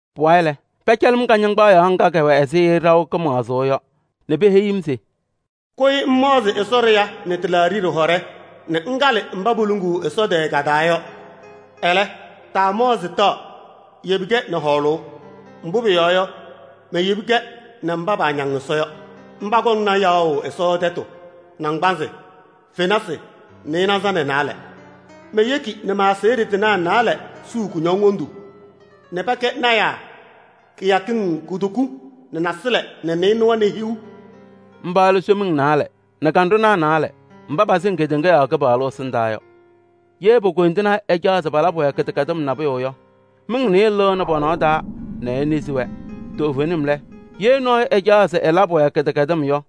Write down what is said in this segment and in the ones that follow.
Pʋwayɩ lɛ, pɛcɛlɩ-m kɩñɩŋgbaɖɛ nɖɩ ɖɩwɛ ɛzɩ ɖaʋ kɩmaɣzʋʋ yɔ nɛ peheyi-m se: “Kʋyɩ ŋmaɣzɩ Ɛsɔ ɖɩɣa nɛ tɩlaaɖɩ ɖɩhɔɖɛ nɛ ŋkalɩ mba poluŋuu Ɛsɔ tɛɛ ka-taa yɔ. Ɛlɛ, taamaɣzɩ taɣ, yebi-kɛ nɛ hɔɔlʋʋ. Mbʋ pʋyɔɔ yɔ, peyebini-kɛ nɛ mba paañaŋ Ɛsɔ yɔ, mba kɔŋna yaɣʋ Ɛsɔ tɛtʋ naŋgbanzɩ fenasɩ nɩɩnaza nɛ naalɛ. Meyeki nɛ ma-aseɣɖe tɩnaa naalɛ suu kutokiŋ nɛ pɛkɛ lɔɔyɩsɩ tɩnaa kɩyakɩŋ kutoku nɛ nasɩlɛ nɛ nɩɩnʋwa nɛ hiu.” Mba lɛ somiŋ naalɛ nɛ kanɖʋnaa naalɛ mba pasɩŋ kedeŋa yɔɔ Kɩpaɣlʋ ɛsɩndaa yɔ. Ye po-koyindinaa ɛcaɣ se palabɩ-wɛ kɩdɛkɛdɩm nabʋyʋ yɔ, miŋ nɩɩyɩ lɩɣnɩ pɔ-nɔsɩ taa nɛ enezi-wɛ. Toovenim lɛ, ye nɔɔyʋ ɛcaɣ se ɛlabɩ-wɛ kɩdɛkɛdɩm yɔ,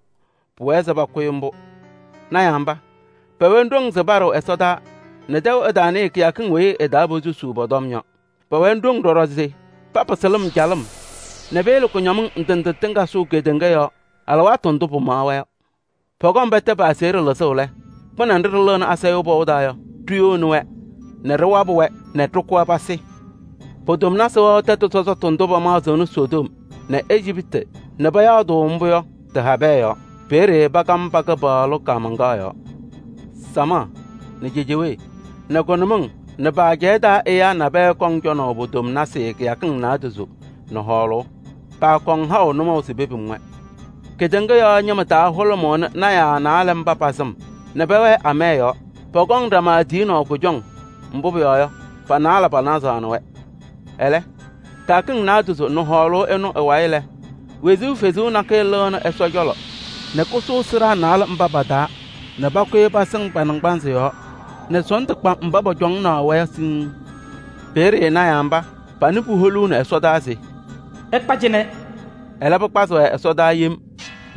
pʋwɛɛ se pʋkʋ-ɩ mbʋ. Lɔɔyɩsɩ tɩnaa mba, pɛwɛnɩ ɖoŋ se paɖɩɣ ɛsɔtɔnʋʋ nɛ tɛʋ ɛtaanɩɩ kɩyakɩŋ weyi ɩ-taa posusuu pɔ-tɔm yɔ. Pɛwɛnɩ ɖoŋ ɖɔɖɔ se papɩsɩ lɩm calɩm nɛ peyele kʋñɔmɩŋ ndɩ ndɩ tɩŋa sʋʋ kedeŋa yɔɔ alɩwaatʋ ndʋ pɩmaɣ-wɛ yɔ. Pɔkɔŋ pɛtɛ pa-aseɣɖe lɩzʋʋ lɛ, kpɩnɛ nɖɩ ɖɩlɩɣnɩ asayʋʋ pɔʋ taa yɔ, ɖiyoni-wɛ nɛ ɖɩwabɩ-wɛ nɛ ɖɩkʋ-wɛ pasɩ. Pe-pilima wɛɣ tɛtʋ sɔsɔtʋ ndʋ pamaɣzɩnɩ Sodom nɛ Ejiptɩ nɛ payaa-tʋ mbʋ yɔ tɩ-habɛɛ yɔɔ. Peeye pakam pa-Kɩpaɣlʋ kaamaŋkaɣ yɔɔ. Samaɣ nɛ cejewee nɛ kʋnʋmɩŋ nɛ ajɛɛ pa-taa ɛyaa nabɛyɛ kɔŋ cɔnaʋ pe-pilima kɩyakɩŋ naadozo nɛ hɔɔlʋʋ. Paakɔŋ haʋ nʋmɔʋ se pepim-wɛ. Kedeŋa yɔɔ ñɩma taa hʋlʋmʋʋnɩ lɔɔyɩsɩ tɩnaa naalɛ mba pa-sɩm nɛ pɛwɛɛ amaya yɔɔ. Pɔkɔŋ ɖama tiyinaʋ kʋjɔŋ, mbʋ pʋyɔɔ yɔ, pa-naalɛ panazaɣnɩ-wɛ. Ɛlɛ, kɩyakɩŋ naadozo nɛ hɔɔlʋʋ ɩnʋ ɩ-wayɩ lɛ, wezuu kalɩzaɣ nakɛyɛ lɩnɩ Ɛsɔ cɔlɔ nɛ kasʋʋ sɩɖaa naalɛ mba pa-taa nɛ pakʋyɩ pasɩŋ pa-naŋgbanzɩ yɔɔ nɛ sɔɔndʋ kpa mba pɔcɔŋaɣnɩ-wɛ yɔ siŋŋ. Peeye lɔɔyɩsɩ tɩnaa mba, panɩ puholuuni ɛsɔdaa se: “Ɩkpa cɩnɛ!” Ɛlɛ pɩkpazɩ-wɛ ɛsɔdaa yem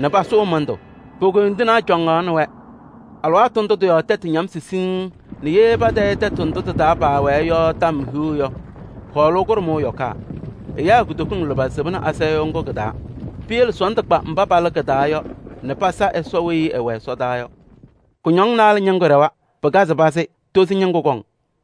nɛ pasʋʋ mɩndʋ, po-koyindinaa cɔŋaɣnɩ-wɛ. Alɩwaatʋ ndʋ tɩ-yɔɔ tɛtʋ ñamsɩ sɔsɔm nɛ ye patayɩ tɛtʋ ndʋ tɩ-taa paawɛɛ yɔ tɔm hiu yɔ, hɔɔlʋʋ kʋɖʋmʋʋ yɔkaa. Ɛyaa kutokiŋ lʋbɛ sɩbɩnɩ asayʋʋ ŋgʋ kɩ-taa. Piyele sɔɔndʋ kpa mba palɩ kɩ-taa yɔ nɛ pasa Ɛsɔ weyi ɛwɛ ɛsɔdaa yɔ. Kʋñɔŋ naalɛ ñɩŋgʋ ɖɛwa. Pɩkazɩ pazɩ, tozo ñɩŋgʋ kɔŋ.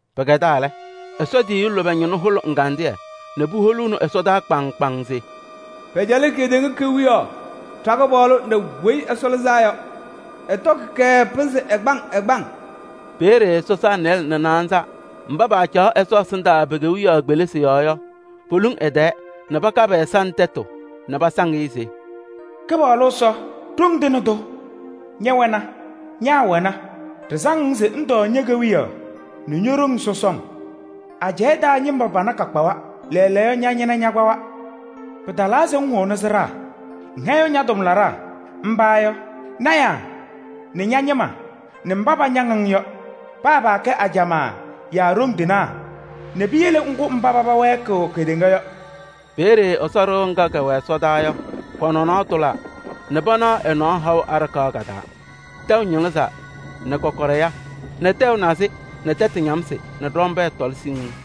Pɩkɛdaa lɛ, Ɛsɔ tiyiyu lʋbɛ ñɩnʋ hʋlɩ ɛgandɩyɛ nɛ puholuuni ɛsɔdaa kpaŋŋ kpaŋŋ se: “Pɛcɛlɩ kedeŋa kewiyaɣ ɖa-Kɩpaɣlʋ nɛ Weyi Ɛlɩzaa Yɔ. Ɛtɔkɩ-kɛ pɩnzɩ ɛgbaŋ ɛgbaŋ!” Peeye sɔsaa nɩɩlɛ nɛ naanza mba paacaɣ Ɛsɔ ɛsɩndaa pe-kewiyaɣ kpelisi yɔɔ yɔ, poluŋ ɛ-tɛɛ nɛ paka pɛ-ɛza nɛ tɛtʋ nɛ pasaŋ-ɩ se: “Kɩpaɣlʋ Ɛsɔ, Ɖoŋ Tɩŋa Tʋ! Ñɛwɛna, ñaawɛna, ɖɩsaŋ-ŋ se ŋtɔɔ ñe-kewiyaɣ nɛ ño-ɖoŋ sɔsɔŋ. Ajɛɛ taa ñɩma pana kakpawa, lɛɛlɛɛyɔ ña-ñɩna ñakpawa! Pɩtalaa se ŋhʋnɩ sɩɖaa: ŋhɛyɩɣ ña-tʋmlaɖaa, mba yɔ: lɔɔyɩsɩ tɩnaa nɛ ña-ñɩma nɛ mba pañaŋ-ŋ yɔ, paa paakɛ ajamaa yaa ɖoŋ tɩnaa nɛ piyele ŋkʋ mba paba wɛɛkɩɣ kedeŋa yɔ.” Peeye Ɛsɔ ɖɩɣa ŋga kɛwɛ ɛsɔdaa yɔ, kɔ-nɔnɔɔ tʋlaa nɛ panaɣ ɛ-nɔɔ haʋ aɖakaɣ ka-taa. Tɛʋ ñɩlɩzaa nɛ kɔkɔɖɛ ya nɛ tɛʋ nazɩ nɛ tɛtʋ ñamsɩ nɛ ɖɔmbɛɛ tɔlɩ siŋŋ.